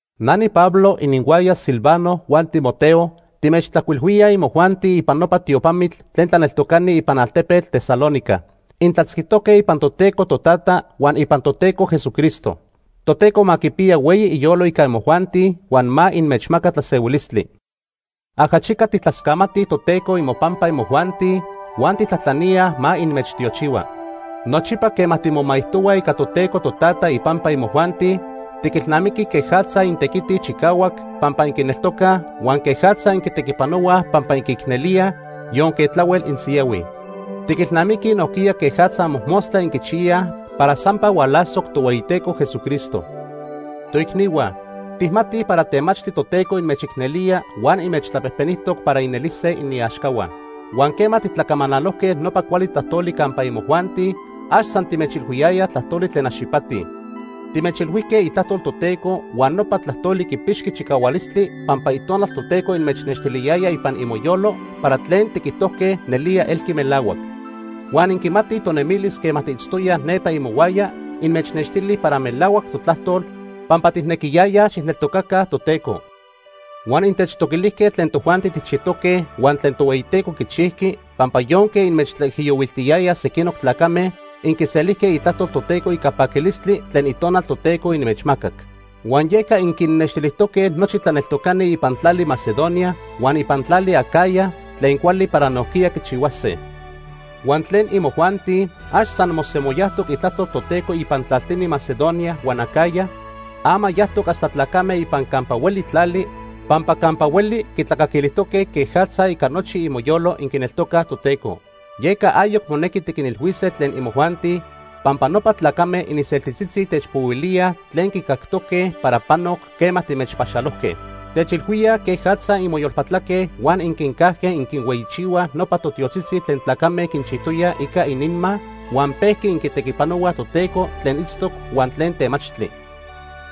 Na niPablo, ininhuaya Silvano huan Timoteo, timechtlajcuilhuíaj imojuanti ipan nopa tiopamitl tlen tlaneltocani ipan altepetl Tesalónica. Intlatzquijtoque ipan Toteco Totata huan ipan Toteco Jesucristo. Toteco ma quipiya hueyi iyolo ica imojuanti huan ma inmechmaca tlasehuilistli. Ajachica tijtlascamatij Toteco imopampa imojuanti huan tijtlajtlaníaj ma inmechtiochihua. Nochipa quema timomaijtohuaj ica Toteco Totata ipampa imojuanti, tiquilnamiquij quejatza intequitij chicahuac pampa inquineltocaj, huan quejatza inquitequipanohuaj pampa inquiicnelíaj, yonque tlahuel insiyahuij. Tiquilnamiquij nojquiya quejatza mojmostla inquichiyaj para sampa hualasoc Tohueyiteco Jesucristo. Toicnihua, tijmatij para temachtli Toteco inmechicnelía huan inmechtlapejpenijtoc para inelise iniaxcahua. Huan quema titlacamanalojque nopa cuali tlajtoli campa imojuanti, ax san timechilhuiyayaj tlajtoli tlen ax ipati. Timechilhuijque itlajtol Toteco huan nopa tlajtoli quipixqui chicahualistli pampa Itonal Toteco inmechnextiliyaya ipan imoyolo para tlen tiquijtojque nelía elqui melahuac. Huan inquimatij tonemilis quema tiitztoyaj nepa imohuaya inmechnextili para melahuac totlajtol, pampa tijnequiyayaj xijneltocaca Toteco. Huan intechtoquilijque tlen tojuanti tijchijtoque huan tlen Tohueyiteco quichijqui, pampa yonque inmechtlaijiyohuiltiyayaj sequinoc tlacame, inquiselijque itlajtol Toteco ica paquilistli tlen Itonal Toteco inmechmacac. Huan yeca inquinnextilijtoque nochi tlaneltocani ipan tlali Macedonia huan ipan tlali Acaya tlen cuali para nojquiya quichihuase. Huan tlen imojuanti, ax san mosemoyajtoc itlajtol Toteco ipan tlaltini Macedonia huan Acaya, ama yajtoc hasta tlacame ipan campa hueli tlali, pampa campa hueli quitlacaquilijtoque quejatza ica nochi imoyolo inquineltocaj Toteco. Yeca ayoc monequi tiquinilhuise tlen imojuanti, pampa nopa tlacame ininseltitzitzi techpohuilíaj tlen quicactoque para panoc quema timechpaxalojque. Techilhuíaj quejatza inmoyolpatlaque huan inquincajque inquinhueyichihuaj nopa totiotzitzi tlen tlacame quinchijtoyaj ica ininma, huan pejqui inquitequipanohuaj Toteco tlen itztoc huan tlen temachtli.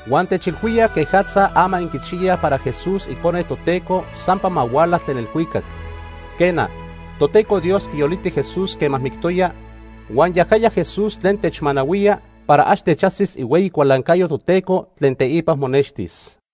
Huan techilhuíaj quejatza ama inquichiyaj para Jesús, icone Toteco, sampa ma huala tlen elhuicac. Quena, Toteco Dios quiyoliti Jesús quema mictoya, huan yajaya Jesús tlen techmanahuía para ax techajsis ihueyi cualancayo Toteco tlen teipa monextis.